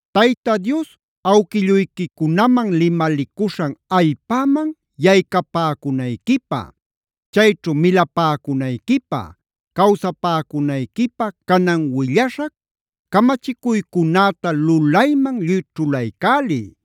Tayta Dios awquilluyquicunaman limalicuśhan allpäman yaycapäcunayquipä, chayćhu milapäcunayquipä, cawsapäcunayquipä canan willaśhac camachicuycunäta lulayman lluy ćhulaycäliy.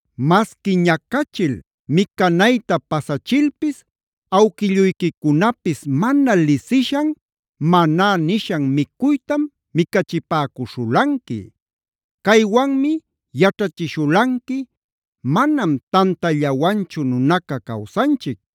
Masqui ñacachil micanayta pasachilpis awquilluyquicunapis mana lisishan ‘Maná’ nishan micuytam micachipäcuśhulanqui. Caywanmi yaćhachishulanqui: ‘Manam tantallawanchu nunaca cawsanchic.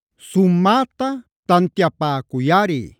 Sumäta tantiapäcuyꞌari,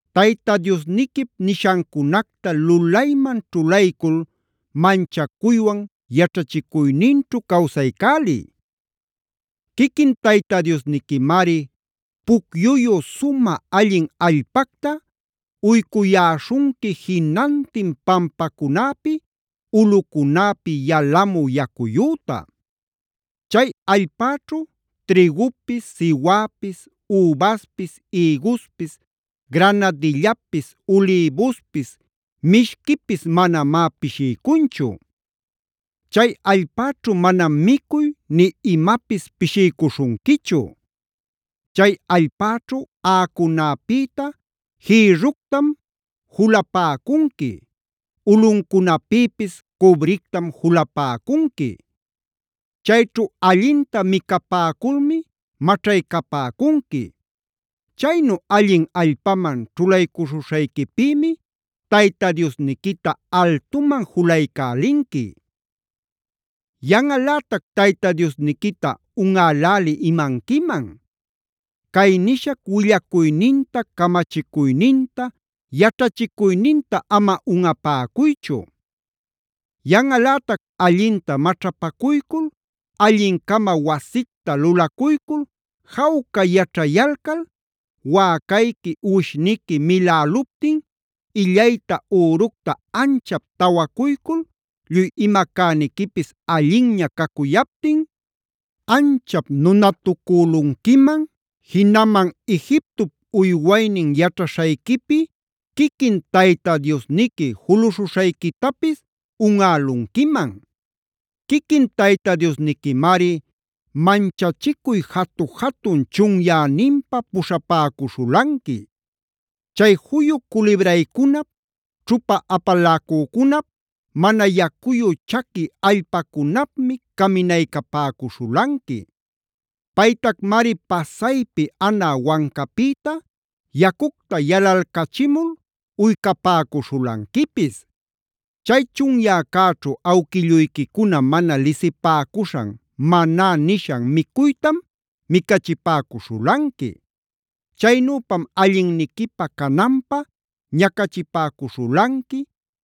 Tayta Diosniquip nishancunacta lulayman ćhulaycul manchacuywan yaćhachicuyninćhu cawsaycäliy. Quiquin Tayta Diosniquimari pucyuyu sumä allin allpacta uycuyäśhunqui jinantin pampacunäpi ulꞌucunäpi yalamü yacuyüta. Chay allpäćhu trïgupis, siwäpis, übaspis, ïguspis, granadillapis, ulïbuspis, mishquipis manamá pishiycunchu. Chay allpäćhu manam micuy nï imapis pishiycuśhunquichu. Chay allpäćhu aꞌacunäpïta jïrructam julapäcunqui; ulꞌuncunapïpis cubrictam julapäcunqui. Chayćhu allinta micapäculmi maćhaycapäcunqui. Chaynu allin allpaman ćhulaycuśhuśhayquipïmi Tayta Diosniquita altuman julaycälinqui. “Yanꞌalätac Tayta Diosniquita unꞌälälï imanquiman. Cay nishac willacuyninta, camachicuyninta, yaćhachicuyninta ama unꞌapäcuychu. Yanꞌalätac allinta maćhapacuycul, allin-cama wasicta lulacuycul jawca yaćhayalcal, wäcayqui, uwishniqui miläluptin, illayta üructa anchap tawacuycul, lluy ima cäniquipis allinña cacuyaptin, anchap nunatucülunquiman, jinaman Egiptop uywaynin yaćhaśhayquipi quiquin Tayta Diosniqui juluśhuśhayquitapis unꞌalunquiman. Quiquin Tayta Diosniquimari manchachicuy jatu-jatun chunyäninpa puśhapäcuśhulanqui. Chay juyu culibraycunap, ćhupa apaläcücunap, mana yacuyu chaqui allpacunapmi caminaycapäcuśhulanqui. Paytacmari pasaypi anä wancapïta yacucta yalalcachimul uycapäcuśhulanquipis. Chay chunyäcäćhu awquilluyquicuna mana lisipäcuśhan ‘Maná’ nishan micuytam micachipäcuśhulanqui. Chaynüpam allinniquipä cananpä ñacachipäcuśhulanqui,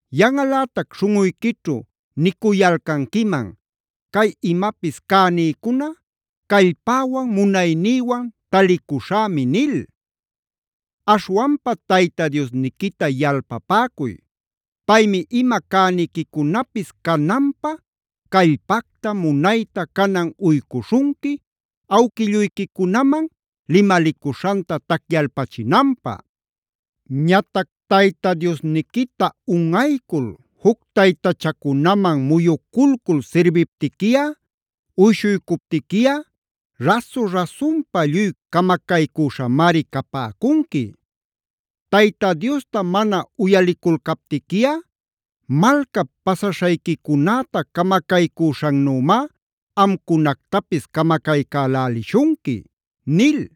Yanꞌalätac śhunꞌuyquićhu nicuyalcanquiman: ‘Cay imapis cänïcuna callpäwan, munaynïwan talicuśhämi’ nil. Aśhwanpa Tayta Diosniquita yalpapäcuy. Paymi ima cäniquicunapis cananpä callpacta, munayta canan uycuśhunqui, awquilluyquicunaman limalicuśhanta tacyalpachinanpä. “Ñatac Tayta Diosniquita unꞌaycul juc taytachacunaman muyuculcul sirbiptiquiꞌa, uyshuycuptiquiꞌa rasu-rasunpa lluy camacaycüśhamari capäcunqui. Tayta Diosta mana uyaliculcaptiquiꞌa malcap pasaśhayquicunäta camacaycüśhannümá amcunactapis camacaycälälishunqui” nil.